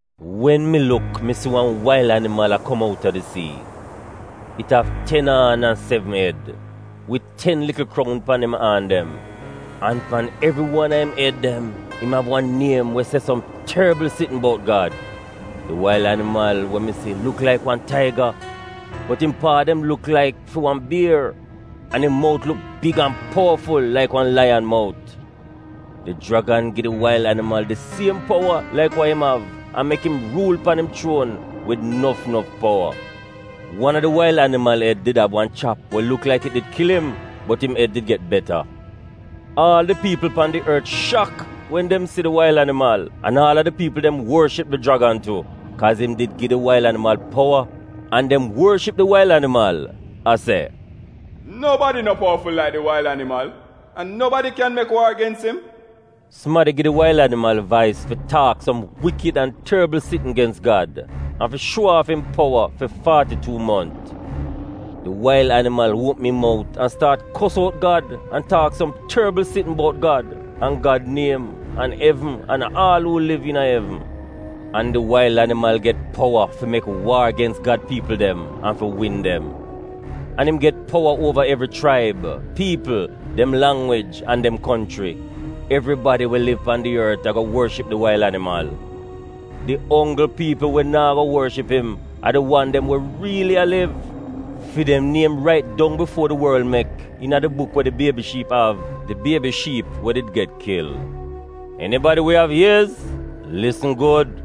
Wen mi luk mi si wan wail animal a kom outa di sii. It av ten aan an sevn ed, wid ten likl kroun pan im aan dem, an pan evri wan a im ed dem im av wan niem we se som torbl sitn bout Gad. Di wail animal we mi si luk laik wan taiga, bot im paa dem luk laik fi wan bier, an im mout luk big an powaful laik wan laiyan mout. Di jragan gi di wail animal di siem powa laik wa im av an mek im ruul pan im chuon wid nof nof powa. Wan a di wail animal ed did av wan chap we luk laik it did kil im, bot im ed did get beta. Aal di piipl pan di ort shak wen dem si di wail animal, an aal a di piipl dem worship di jragan tu, kaaz im did gi di wail animal powa, an dem worship di wail animal a se, “Nobadi no powaful laik di wail animal? An nobadi kyan mek waar gens im? Sumadi gi di wail animal vais fi taak som wikid an torbl sitn gens Gad an fi shuo aaf im powa fi faati-tuu mont. Di wail animal uopm im mout an staat kos out Gad an taak som torbl sitn bout Gad an Gad niem an evn an aal uu liv iina evn. An di wail animal get powa fi mek waar gens Gad piipl dem an fi win dem. An im get powa uova evri chraib, piipl, dem langwij an dem konchri. Evribadi we liv pan di ort ago worship di wail animal. Di onggl piipl we naa go worship im a di wan dem we riili a liv. Fi dem niem rait dong bifuo di worl mek iina di buk we di Biebi Shiip av — di Biebi Shiip we did did get kil. Enibadi we av iez, lisn gud.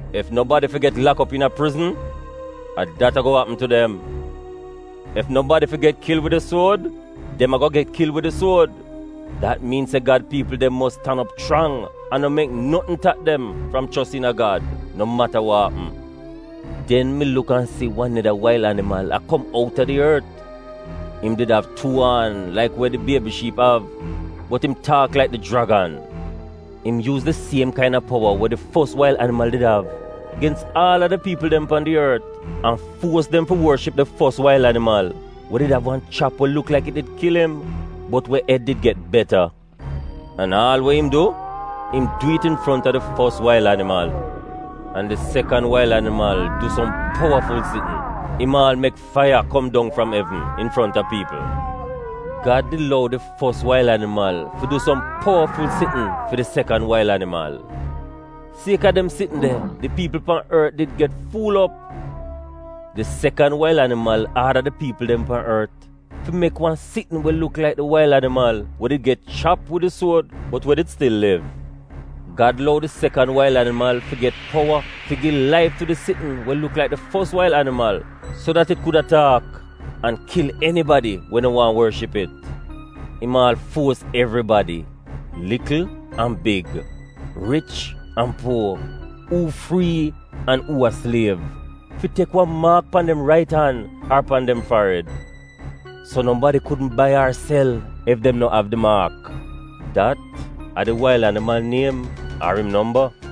Ef nobadi fi get lak op iina prizn, a dat ago apm tu dem. Ef nobadi fi get kil wid di suod, dem ago get kil wid di suod. Dat miin se Gad piipl dem mos tan op chrang an no mek notn tap dem fram chos iina Gad no mata wa apm. Den mi luk an si wan neda wail animal a kom op outa di ort. Im did av tuu aan laik we di Biebi Shiip av, bot im taak laik di jragan. Im yuuz di siem kaina powa we di fos wail animal did av gens aal a di piipl dem pan di ort an fuos dem fi worship di fos wail animal we did av wan chap we luk laik it did kil im, bot we ed did get beta. An aal we im du, im du it infronta di fos wail animal. An di sekan wail animal du som powaful sitn, im aal mek faiya kom dong fram evn infronta piipl. Gad did lou di fos wail animal fi du som powaful sitn fi di sekan wail animal. Kaaz a dem sitn de di piipl pan ort did get fuul op. Di sekan wail animal aada di piipl dem pan ort fi mek wan sitn we luk laik di wail animal we did get chap wid di suod bot we did stil liv. Gad lou di sekan wail animal fi get powa fi gi laif tu di sitn we luk laik di fos wail animal so dat it kuda taak, an kil enibadi we no waahn worship it. Im aal fuos evribadi, likl an big, rich an puo, uu frii an uu a sliev, fi tek wan maak pan dem rait an ar pan dem farid. So nobadi kudn bai ar sel ef dem no av di maak — dat a di wail animal niem ar im nomba.